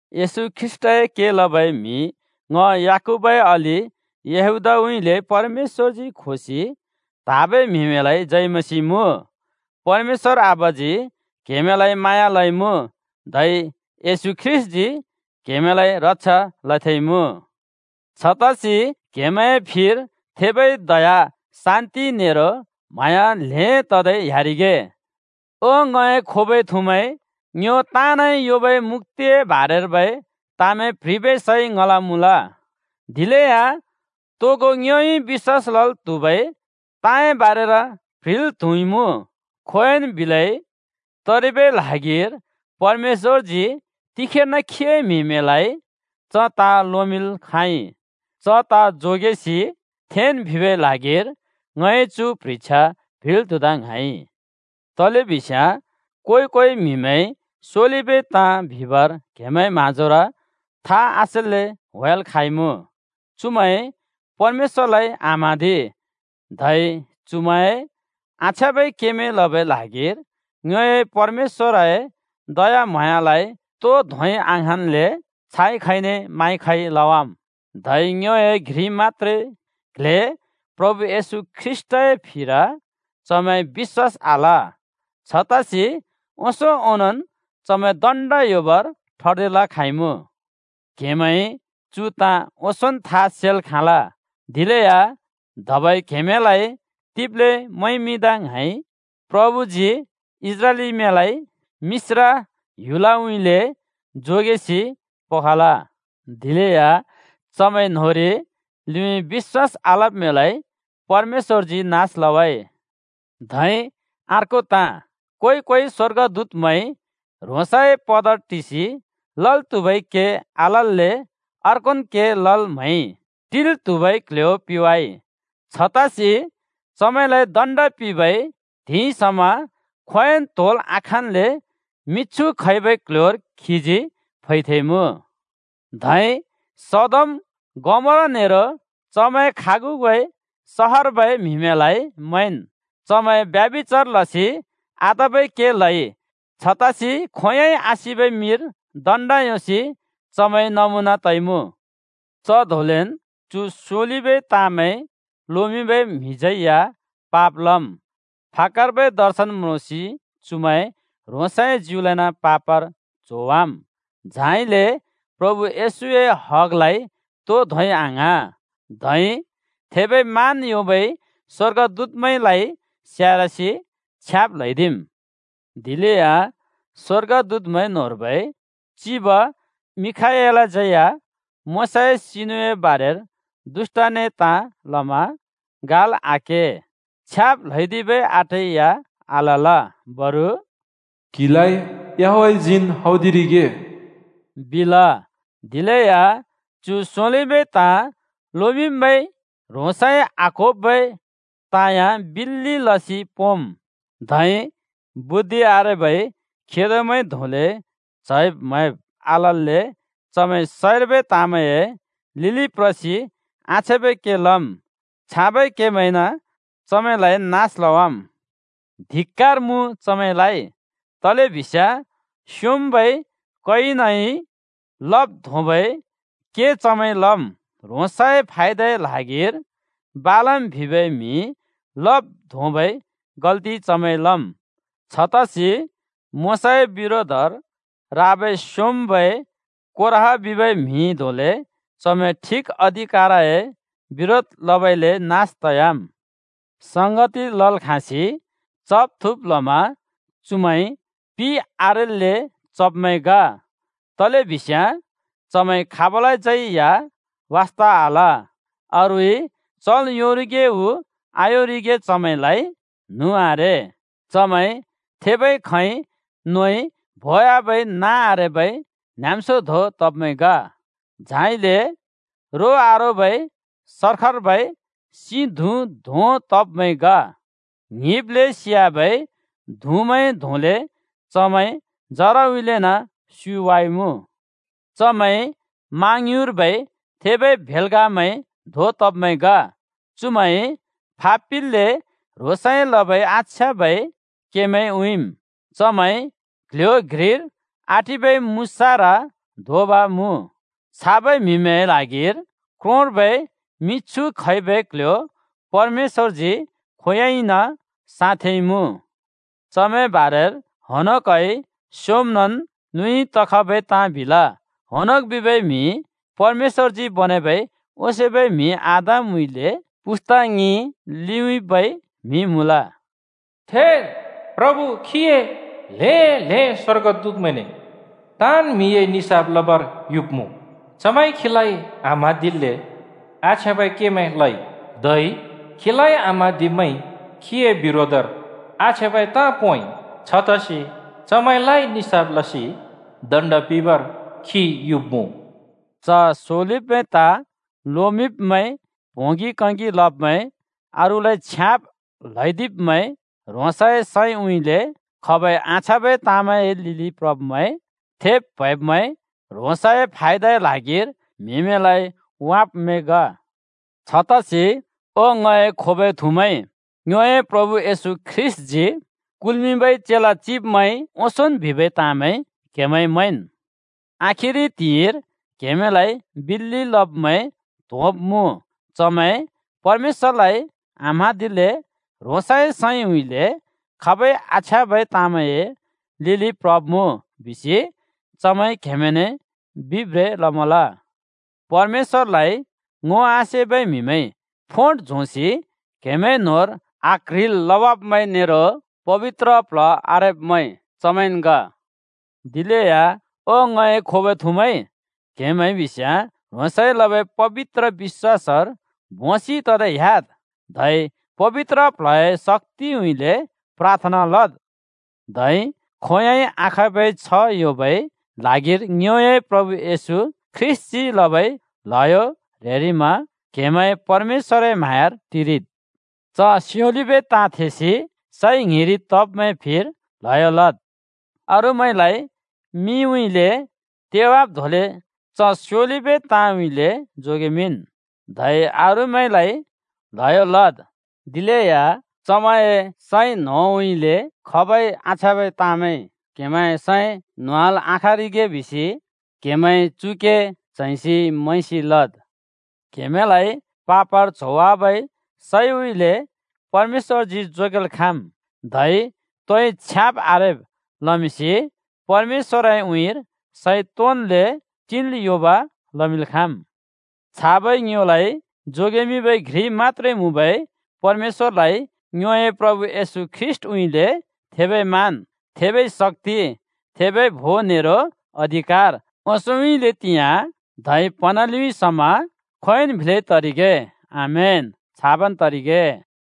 येशू ख्रीष्‍टए के लबै म्हि ङ याकूबए अलि यहूदाउँइँले परमेश्‍वरजी खोसि त्‍हाँबै म्‍हिमैंलाइ जय मसीह मुँ। परमेश्‍वर आबाजी क्हेमैंलाइ म्हाँया लइमुँ, धै येशू ख्रीष्‍टजी क्हेमैंलाइ रक्षा लथेंइमुँ। छतसि क्‍हेमैंए फिर थेबै दया, शान्ति नेरो म्हाँया ल्हें तदै ह्‍यारिगे। ओ ङए खोबै थुमैं, ङ्यो ताँनइ योंबै मुक्‍तिए बारेर्बै ताँमैं प्‍ह्रिबै सैं ङल मुँल। दिलेया तोगो ङ्योइ बिश्‍वास लल् त्हुबै ताँए बारेर प्‍ह्रिल् त्‍हुइमुँ। खोंयोंन् बिलै तरिबै ल्हागिर परमेश्‍वरजी तिखेर्न खीए म्‍हिमैंलाइ च ताँ लोमिंल् खाँइ। च ताँ जोगेसि थेंन् बिबै ल्हागिर ङइ चु प्ह्रिछ्या प्ह्रिल् त्हुदा ङ्हाँइ। तलेबिस्याँ को-कोइ म्‍हिमैं स्योलिबै ताँ बिबर क्हेमैंए म्हाँजोर था आसेल्‍ले होंयाल् खाँइमुँ। चुमैंइ परमेश्‍वरलाइ आम्हाँदि, धै चुमैंए आछ्याँबै केमैं लबै ल्हागिर ङ्योए परमेश्‍वरए दयाम्हाँयालाइ तो धोंइ आङ्हाँन्ल्‍ले छाइ खैने माइ खै लवाम्। धै ङ्योए घ्रि मत्‍त्रे क्ल्हे प्रभु येशू ख्रीष्‍टए फिर चमैंइ बिश्‍वास आल। छतसि ओंसों ओंनोंन् चमैं दण्ड योंबर ठर्दिल् खाँइमुँ। क्‍हेमैंइ चु ताँ ओंसोंन् था सेल् खाँल। दिलेया धबै क्हेमैंलाइ तिब्ले मैंमिंदा ङ्हाँइ, प्रभुजी इस्राएलीमैंलाइ मिश्र ह्‍युलउँइँले जोगेसि पखल, दिलेया चमैं न्होंरि लिउँइँ बिश्‍वास आलब्मैंलाइ परमेश्‍वरजी नास लवाइ। धै अर्को ताँ, को-कोइ स्‍वर्गदूतमैंइ ह्रोंसए पदर टिसि लल् त्हुबै के आलल्‍ले अर्कोन् के लल् म्हैइ, टिल् त्हुबै क्ल्ह्‍यो पिवाइ। छतसि चमैंलाइ दण्‍ड पिंबै त्हिंइ समा खोंयोंइ त्होंल् आखाँल्‍ले मिछु खैबै क्ल्ह्‍योर खीजी फैथेंइमुँ। धै सदोम, गमोरा नेरो चमैंए खागुबै सहरर्बै म्हिमैंलाइ मैंन्। चमैंइ ब्यभिचार लसि आतबै के लइ। छतसि खोंयोंइ आसिबै मिर दण्‍ड योंसि चमैं नमुना तइमुँ। च धोंलेन् चु स्‍योलिबै ताँमैं लोमिंबै म्‍हिमैंज्‍यै या पाप लम्। फाक्‍कर्बै दर्शन म्रोंसि चुमैंइ ह्रोंसए ज्युलाइन पापर च्होवाम्। झाइले प्रभु येशूए हगलाइ तो धोंइ आङ्हाँ, धै थेबै मान योंबै स्‍वर्गदूतमैंलाइ स्यारसि छ्याब् ल्हैदिम्। दिलेया स्वर्गदूतमैं न्होंर्बै चिब मिखाएलज्यै या मोशाए सिनुए बारेर दुष्‍ट‍ने ताँ लमा गाल् आके, छ्याब् ल्हैदिबै आँटै या आलल, बरु “क्‍हिलाइ याहवेहजीन् हौदिरिगे,” बिल। दिलेया चु स्‍योलिबै ताँ लोमिंब्‍मैंइ ह्रोंसइ आक्‍होबै ताँ या बिल्‍लि लसि पोंम्। धै बुद्धि आरेबै खेदोमैं धोंले च्हैंब् मैंब् आलल्‍ले चमैं सैंर्बै ताँमैंए लिलि प्रसि आछ्याँबै के लम्। छाबै केमैंइन चमैंलाइ नास लवाम्। धिक्‍कार मुँ चमैंलाइ। तलेबिस्याँ स्‍योंम्‍बै कयिनइ लब् धोंबै के चमैंइ लम्। ह्रोंसए फायदए ल्हागिर बालम बिबै म्हिइ लब् धोंबै गल्‍ति चमैंइ लम्। छतसि मोशाए बिरोधर राबै स्‍योंम्‍बै कोरह बिबै म्‍हि धोंले चमैंइ ठिक अधिकारए बिरोध लबइले नास तयाम्। संगति लल् खाँसि चब् थुँब् लमा चुमैं पि आरेल्‍ले चब्मैं ग। तलेबिस्याँ चमैंइ खाबलाज्यै या वास्ता आल, अरूइ चल् योंरिगे उ आयोंरिगे चमैंलाइ न्हुँ आरे। चमैं थेबै खैंइ नोइ बोवाबै नाँ आरेबै न्‍हाँम्‍स्यो धों तब्मैं ग। झाइले रो आरोबै सर्खर्बै सिं धुँ धों तब्मैं ग, ङ्हिब्‍ले सियाबै धुँमैं धोंले चमैं जराउँइँलेन् स्‍युवाइमुँ। चमैं मा ङ्युँरर्बै थेबै भेल्‍गामैं धों तब्मैं ग। चुमैंइ फापिल्‍ले ह्रोंसइ लबै आछ्याँबै केमैं उँइँम्। चमैं क्‍ल्‍ह्‍यो घ्रिर आटिबै मुसारा धोंब मुँ। छाबै म्‍हिमैंए ल्हागिर क्रोंर्बै मिछु खैबै क्‍ल्‍ह्‍यो परमेश्‍वरजी खोंयोंइन साँथेंइमुँ। चमैंए बारेर हनोकइ स्‍योमनन् लिउँइँ तखबै ताँ बिल। (हनोक बिबै म्‍हि परमेश्‍वरजी बनेबै ओंसोंबै म्‍हि आदमउँइँले पुस्‍ता ङि लिउँइँबै म्‍हि मुँल।) “थेद्, प्रभु खीए हजारौं-हजारौं स्‍वर्गदूतमैंने ताँन् म्‍हिए निसाफ लबर युब्‍मुँ। चमैंइ खीलाइ आम्हाँदिल्‍ले आछ्याँबै केमैं लइ, धै खीलाइ आम्हाँदिब्मैंइ खीए बिरोधर आछ्याँबै ताँ पोंइ, छतसि चमैंलाइ निसाफ लसि दण्ड पिंबर खी युब्मुँ।” च स्योलिबै ताँ लोमिंब्‍मैं प्होंगि कैगि लब्मैं, अरूलाइ छ्याब् ल्हैदिब्मैं, ह्रोंसए सैंउँइँले खबै आछ्याँबै ताँमैंए लिलि प्रब्मैं, थेब् प्‍हैंब्मैं, ह्रोंसए फायदाए ल्हागिर म्‍हिमैंलाइ वाँब्मैं ग। छतसि ओ ङए खोबै थुमैं, ङ्योए प्रभु येशू ख्रीष्‍टजी कुल्मिंबै चेला चिब्मैंइ ओंसोंन् बिबै ताँमैं क्हेमैंइ मैंन्। “आखिरि त्हिंइर क्‍हेमैंलाइ बिल्‍लि लब्‍मैं त्होंब्मुँ। चमैं परमेश्‍वरलाइ आम्हाँदिल्‍ले ह्रोंसए सैंउँइँले खबै आछ्याँबै ताँमैंए लिलिन् प्रब्‍मुँ,” बिसि चमैंइ क्‍हेमैंने बिब्रें लमल। परमेश्‍वरलाइ ङो आसेबै म्हिमैं, फोट झोंसि क्हेंमैंए न्होंर आक्ह्रिल् लवाब्मैं नेरो पबित्र प्ल्ह आरेब्मैं चमैंन् ग। दिलेया ओ ङए खोबै थुमैं, क्‍हेमैं बिस्‍याँ ह्रोंसइ लबै पबित्र बिश्‍वासर भोंसि ततै ह्‍याद्, धै पबित्र प्ल्हए शक्‍तिउँइँले प्राथना लद्। धै खोंयोंइ आखाँबै छ्ह योंबै ल्हागिर ङ्योए प्रभु येशू ख्रीष्‍टजी लबै ल्हयो ह्रेरिमा क्हेमैं परमेश्‍वरए म्हाँयार टिरिद्। च स्‍योलिबै ताँ थेसि सैं ङ्हिरि तब्‍मैंए फिर ल्हयो लद्; अरूमैंलाइ मिउँइँले तेवाब् धोंले च स्‍योलिबै ताँउँइँले जोगेमिंन्; धै अरूमैंलाइ ल्हयो लद्, दिलेया चमैंए सैं न्होंउँइँले खबै आछ्याँबै ताँमैंइ क्हेमैंए सैं न्होंवाल् आखाँरिगे बिसि क्हेमैंइ चु के च्हैंसि मैंसि लद्। क्‍हेमैंलाइ पापर च्होवाबै सैउँइँले परमेश्‍वरजी जोगेल् खाँम्, धै तोइ छ्याब् आरेब् लमिंसि परमेश्‍वरए उँइँर सैं तोंन्ले टिल् योंब लमिंल् खाँम्। छाबै ङ्योलाइ जोगेमिंबै घ्रि मत्‍त्रे मुँबै परमेश्‍वरलाइ ङ्योए प्रभु येशू ख्रीष्‍टउँइँले थेबै मान, थेबै शक्‍ति, थेबै भों नेरो अधिकार, ओंसोंउँइँले तिंयाँ धै प्हँना लिउँइँ समा खोंयोंन् बिलै तरिगे! आमेन, छाबन् तरिगे!